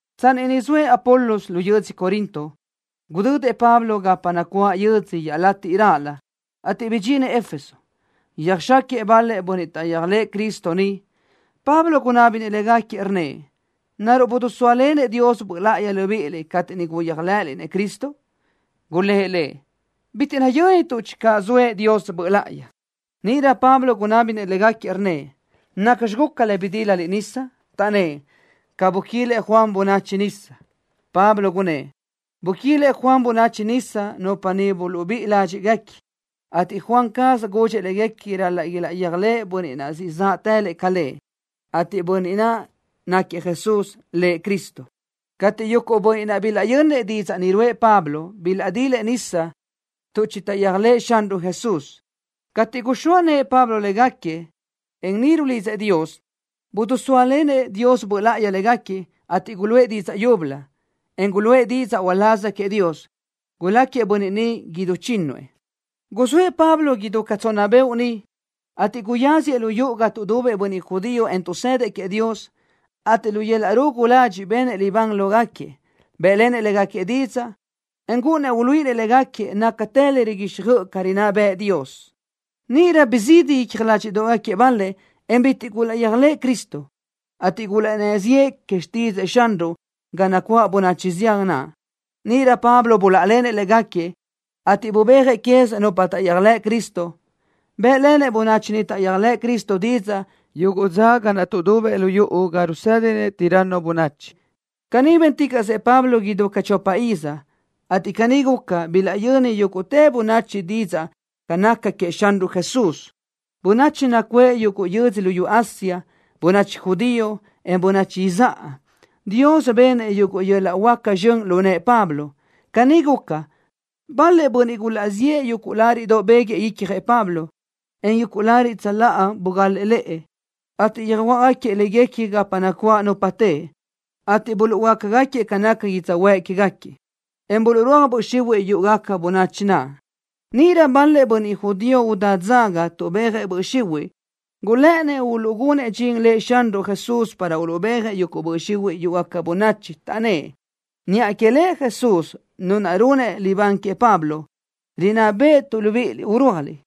Tsanni niʼ zoëʼ Apolos lu yödzö Corinto, gudödëʼ Pablo gapa nacuáʼ yödzö iaʼlatiʼ raʼlö, ateʼ bidxinëʼ Éfeso. Yöjxáquiëʼ bal-lëʼ bönniʼ taʼyéajlëʼë Cristo niʼ. Pablo gunábinëʼ légaquiëʼ, rnnëʼ: —¿Naruʼ bidisóalenëʼ Dios Böʼ Láʼayi libíʼiliʼ cateʼ niʼ guyéajlëʼëliʼ Cristo? Gulë́ʼ lëʼ: —Bitiʼ nayö́nituʼ channö zoëʼ Dios Böʼ Láʼayi. Níʼirö Pablo gunábinëʼ légaquiëʼ, rnnëʼ: —¿Nacxi guca le bidílaliʼ nisa? Taʼnnë́ʼ: —Ca buquílëʼ Juan bönachi nisa. Pablo gunnë́ʼ: —Buquílëʼ Juan bönachi nisa, nupa niʼ buluʼbíʼi ládxiʼguequi, ateʼ Juan caz gudxëʼ léguequi ral-laʼ ilaʼyéajlëʼ Bönniʼ naʼ siʼ záʼtëlëʼ ca lëʼ, ateʼ Bönniʼ ni naquiëʼ Jesús, Lëʼ Cristo. Cateʼ yuguʼ bönniʼ naʼ bilaʼyönnëʼ didzaʼ ni ruʼë Pablo, bilaʼdilëʼ nisa tuʼ chitaʼyéajlëʼë Xanruʼ Jesús. Cateʼ guxóa nëʼë Pablo légaquiëʼ, en niʼ rulidzëʼ Dios, bidisóalenëʼ Dios Böʼ Láʼayi légaquiëʼ, ateʼ guluʼë didzaʼ yúbölö, en guluʼë didzaʼ uláz queëʼ Dios. Guláquiëʼ bönniʼ ni idú chínnuëʼ. Guzóëʼ Pablo idú ca tsonna beoʼ niʼ, ateʼ guyáziëʼ lu yuʼu ga tuʼdubëʼ bönniʼ judío, en tuʼsëdëʼ queëʼ Dios, ateʼ lu yöl-laʼ rugu ladxiʼ benëʼ libán lógaquiëʼ. Bë́ʼlenëʼ légaquiëʼ didzaʼ, en gúʼunnëʼ uluíʼinëʼ légaquiëʼ nácatë le riguíxjöʼë ca rinná bëʼë Dios. Níʼirö bizídi icja ládxiʼdoʼgaquiëʼ bal-lëʼ, en bitiʼ gulaʼyéajlëʼë Cristo, ateʼ gulaʼnnë́ ziʼë que xtídzëʼë Xanruʼ ga nacuáʼ bönachi zián naʼ. Níʼirö Pablo buláʼalenëʼ légaquiëʼ, ateʼ bubéajëʼ quez nupa taʼyéajlëʼ Cristo. Bë́ʼlenëʼ bönachi ni taʼyéajlëʼ Cristo didzaʼ yuguʼ dza ga naʼ tuʼdubëʼ lu yuʼu ga rusédinëʼ Tiranno bönachi. Caní bénticaʼsëʼ Pablo idú ca chopa iz, ateʼ caní guca, bilaʼyöni yúguʼtë bönachi didzaʼ ca naca queëʼ Xanruʼ Jesús, bönachi nacuʼë yuguʼ yödzö luyú Asia, bönachi judío, en bönachi izáʼa. Dios benëʼ yuguʼ yöl-laʼ huáca zxön lu nëʼë Pablo. Caní guca, bal-lëʼ bönniʼ gulaʼziʼë yuguʼ láriʼdoʼ béguëʼë icjëʼ Pablo, en yuguʼ lariʼ tsöláʼa bugalëʼ lëʼë, ateʼ yöjuáʼgaquiëʼ léguequi gapa nacuáʼ nupa teʼe, ateʼ buluʼhuöáquiëʼ ca naca yödzöhuë́ʼ que queë́gaquiëʼ, en buluʼrúaj böʼ xihuiʼ yúʼugaca bönachi naʼ. Níʼirö bal-lëʼ bönniʼ judío udá dzaga tuʼbéajëʼ böʼ xihuiʼ gulë́ʼënnëʼ uluʼgunëʼ dxin Lëʼ Xanruʼ Jesús para uluʼbéajëʼ yuguʼ böʼ xihuiʼ yúʼugaca bönachi, taʼnnë́ʼ: —Niʼa que Lëʼ Jesús, Nu naʼ runëʼ libán que Pablo, rinná béʼetuʼ libíʼiliʼ urúajliʼ.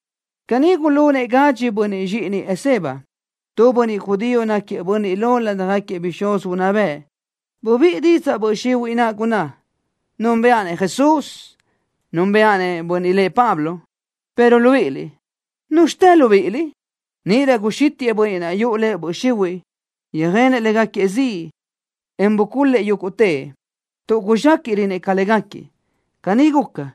Caní gulunëʼ gadxi bönniʼ zxíʼinëʼ Esceva, tu bönniʼ judío náquiëʼ bönniʼ lo ládjagaquiëʼ bixúz unná bëʼ. Bubíʼi didzaʼ böʼ xihuiʼ naʼ, gunná: —Núnbëʼa-nëʼ Jesús, en núnbeʼedaʼ bönniʼ lëʼ Pablo, pero libíʼiliʼ, ¿núzxitë libíʼiliʼ? Níʼirö guxítiʼë bönniʼ naʼ yuʼu lëʼ böʼ xihuiʼ, yöjenëʼ légaquiëʼ ziʼ, en bucul-lëʼ yúguʼtëʼ, tuʼ guzxéquiʼrönëʼ ca légaquiëʼ. Caní guca,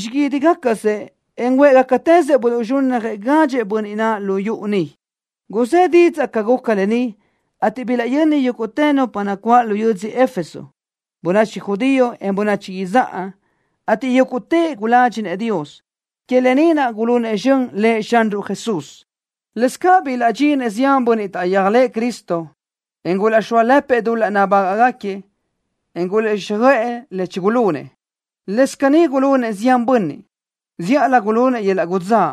xiguídigacasëʼ, en huë́ʼgacatëzëʼ buluʼzxúnnajëʼ gadxëʼ bönniʼ naʼ lu yuʼu niʼ. Guzë́ didzaʼ ca guca lë ni, ateʼ bilaʼyöni yúguʼtë nupa nacuáʼ lu yödzö Éfeso, bönachi judío, en bönachi izáʼa, ateʼ yúguʼtëʼ guládxinëʼ Dios. Que lë ni naʼ gulunëʼ zxön Lëʼ Xanruʼ Jesús. Lëscaʼ bilaʼdxinëʼ zián bönniʼ taʼyéajlëʼë Cristo, en gulaʼxóalëpëʼ dul-laʼ nabágaʼgaquiëʼ, en gulaʼguíxjöʼë le chigulunëʼ. Lëscaʼ caní gulunëʼ zián bönniʼ, zíʼalö gulunëʼ yöl-laʼ udzáʼ.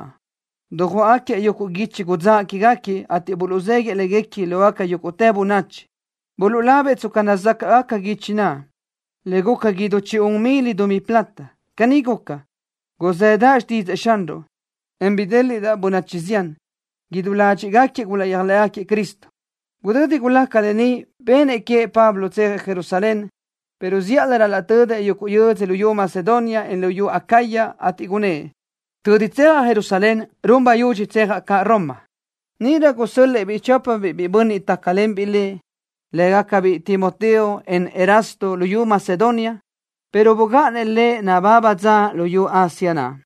Dujuáʼagaquiëʼ yuguʼ guichi udzáʼ quégaquiëʼ, ateʼ buluʼzéguiʼë léguequi lógaca yúguʼtë bönachi. Buluʼlabëʼ tsca nazácaʼgaca guichi naʼ, le guca idú chi un mil dumí plata. Caní guca, guzëdaʼ xtídzëʼë Xanruʼ, en bidéliʼdaʼ bönachi zián. Idú ládxiʼgaquiëʼ gulaʼyéajlëʼë Cristo. Gudödi gulaca lë ni, benëʼ queëʼ Pablo tsejëʼ Jerusalén, pero zíʼalö ral-laʼ tödëʼ yuguʼ yödzö luyú Macedonia, en luyú Acaya, ateʼ gunnë́ʼ: —Tödi tsejaʼ Jerusalén, run bayudxi tsejaʼ caʼ Roma. Níʼirö gusö́l-lëʼë-biʼ chópabiʼ biʼi bönniʼ tácalenbiʼ lëʼ, lë́gacabiʼ Timoteo, en Erasto, luyú Macedonia, pero bugáʼanëʼ lëʼ nababa dza luyú Asia naʼ.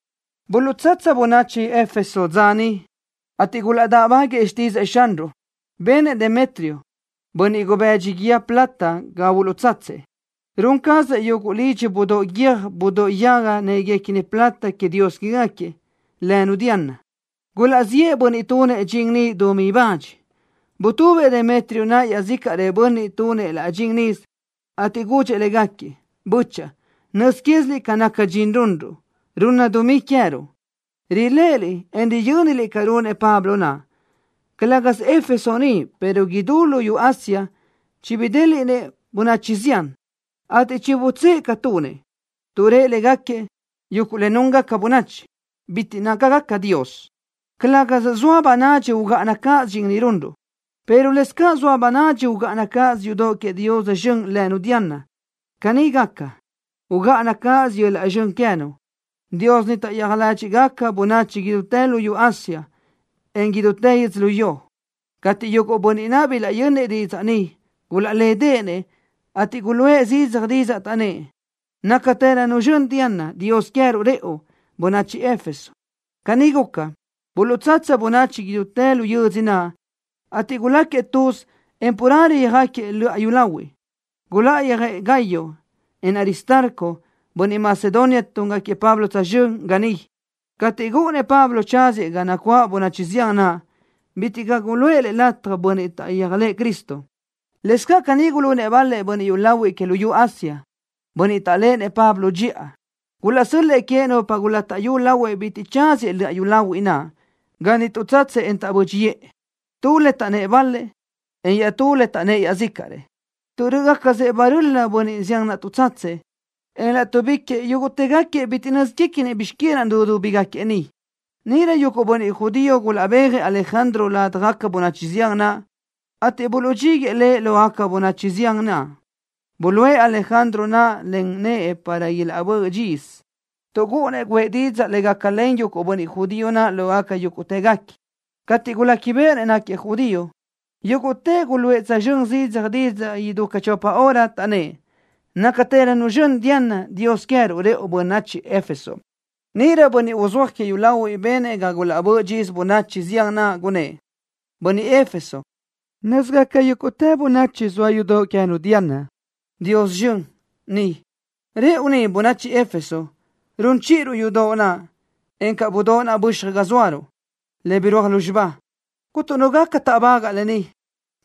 Buluʼtsatsa bönachi Éfeso dza niʼ, ateʼ gulaʼdáʼbaguëʼë xtídzëʼë Xanruʼ. Benëʼ Demetrio, bönniʼ gubëdxi guíë plata ga buluʼtsatsëʼ. Run cazëʼ yuguʼ lidxi budóʼ guiö́j budóʼ yaga néquiguequini plata que dios quégaquiëʼ, lënu Diana. Gulaʼziʼë bönniʼ tunëʼ dxin ni dumí bach. Butubëʼ Demetrio naʼ iaʼzícaʼrëʼ bönniʼ tunëʼ laʼ dxin nisö, ateʼ gudxëʼ légaquiëʼ: —Böchaʼa, nöz quéziliʼ ca naca dxin runruʼ, runna dumí queë́ruʼ. Riléʼeliʼ, en riyö́niliʼ ca runëʼ Pablo naʼ. Calë́gasö Éfeso ni, pero idú luyú Asia chibidéliʼnëʼ bönachi zián, ateʼ chibutsë́ʼë ca tunëʼ, tuʼ rëʼ légaquiëʼ: “Yúgu le núngaca bönachi bitiʼ nácagaca dios.” Calë́gasö zoa bönadxi ugáʼana cáʼasö dxin ni runruʼ, pero lëscaʼ zoa bönadxi ugáʼana cáʼasö yudoʼ que dios zxön lënu Diana. Caní gaca, ugáʼana cáʼasö yöl-laʼ zxön queë́nu, dios ni taʼyéaj ládxiʼgaca-nu bönachi idútë luyú Asia, encaʼ idútë yödzölió. Cateʼ yuguʼ bönniʼ naʼ bilaʼyönnëʼ didzaʼ ni, gulaʼlédeʼenëʼ, ateʼ guluʼë zidzaj didzaʼ, taʼnnë́ʼ: —Nácatërönu zxön Diana, dios queë́ruʼ rëʼu, bönachi Éfeso. Caní guca, buluʼtsatsa bönachi idútë lu yödzö naʼ, ateʼ guláquiëʼ tuz, en carelö yöjáquiëʼ löʼa yúlahuiʼ. Guláʼayöjëʼ Gayo, en Aristarco, bönniʼ Macedonia túngaquiëʼ Pablo tsözxö́n, ga niʼ. Cateʼ gúʼunnëʼ Pablo tsáziëʼ ga nacuáʼ bönachi zián naʼ, bitiʼ caʼ guluʼë lëʼ lataj bönniʼ taʼyéajlëʼë Cristo. Lëscaʼ caní gulunëʼ bal-lëʼ bönniʼ yúlahuiʼ que luyú Asia, bönniʼ taʼléʼenëʼ Pablo dxiʼa. Gulaʼsö́l-lëʼë queëʼ nupa gulátaʼyu lahuëʼ bitiʼ tsaziëʼ löʼa yúlahuiʼ naʼ. Ga niʼ tuʼtsatsëʼ, en taʼbö́dxiʼë, tu le taʼnnë́ʼ bal-lëʼ, en iaʼtú le taʼnnë́ʼ iaʼzícaʼrëʼ, tuʼ rö́ʼögacasëʼ baröli bönniʼ zián naʼ tuʼtsatsëʼ, en láʼtuʼbiquiʼ yúguʼtëgaquiëʼ bitiʼ nö́zguequinëʼ bizx que naʼ nudúbigaquiëʼ niʼ. Níʼirö yuguʼ bönniʼ judío gulaʼbéajëʼ Alejandro ladaj bönachi zián naʼ, ateʼ buluʼdxíguëʼë lëʼ lógaca bönachi zián naʼ. Buluʼe Alejandro naʼ len nëʼë para ilaʼbö́ʼ dxisö, tuʼ gúʼunnëʼ guʼë didzaʼ le gácalen yuguʼ bönniʼ judío naʼ lógaca yúguʼtëguequi. Cateʼ guléquibeʼenëʼ náquiëʼ judío, yúguʼtëʼ guluʼë tsözxö́n zidzaj didzaʼ idú ca chopa hora, taʼnnë́ʼ: —¡Nácatërönu zxön Diana, dios queë́ruʼ rëʼu bönachi Éfeso! Níʼirö bönniʼ uzúaj que yúlahuiʼ benëʼ ga gulaʼbö́ʼ dxisö bönachi zián naʼ, gunnë́ʼ: —Bönniʼ Éfeso, nö́zigaca yúguʼtë bönachi zoa yudoʼ queë́nu Diana, dios zxön, ni. Rëʼu ni, bönachi Éfeso, run chíʼiruʼ yudoʼ naʼ, encaʼ budóʼ naʼ böxaj ga zóaruʼ, le birúaj lúzxiba. Cuntu nu gaca táʼbagaʼ lë ni.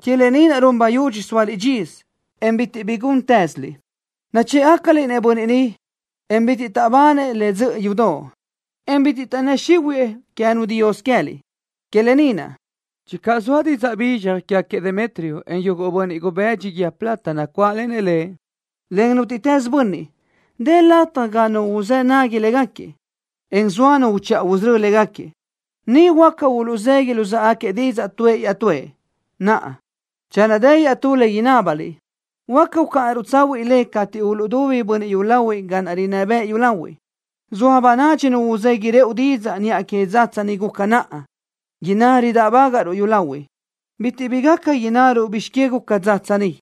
Que lë ni naʼ run bayudxi sóaliʼ dxisö, en bitiʼ bi gúntëziliʼ. Nachë́ʼgacaliʼ-nëʼ bönniʼ ni, en bitiʼ taʼbanëʼ le dzöʼö yudoʼ, en bitiʼ taʼnnë́ xihuëʼë queë́nu dios queë́liʼ. Que lë ni naʼ, channö zoa didzaʼ bizxaj quégaquiëʼ Demetrio, en yuguʼ bönniʼ gubëdxi guíë plata nacuáʼlenëʼ lëʼ, len nútiʼtës bönniʼ, dë lataj ga nu uzë́ nagui légaquiëʼ, en zoa nu uchiʼa usörö́ légaquiëʼ. Niʼ huáca uluʼzegui luzáʼagaquiëʼ didzaʼ tuëʼ iaʼtúëʼ. Naʼa, channö dë iaʼtú le inábaliʼ, huáca ucáʼanaruʼ tsahuiʼ le cateʼ uluʼdubi bönniʼ yúlahuiʼ ca naʼ rinná bëʼ yúlahuiʼ. Zoa bönadxi nu uzegui rëʼu didzaʼ niʼa que dzatsa ni guca naʼa, inná ridáʼbagaʼruʼ yúlahuiʼ. Bitiʼ bi gaca innaruʼ bizx que guca dzatsa ni.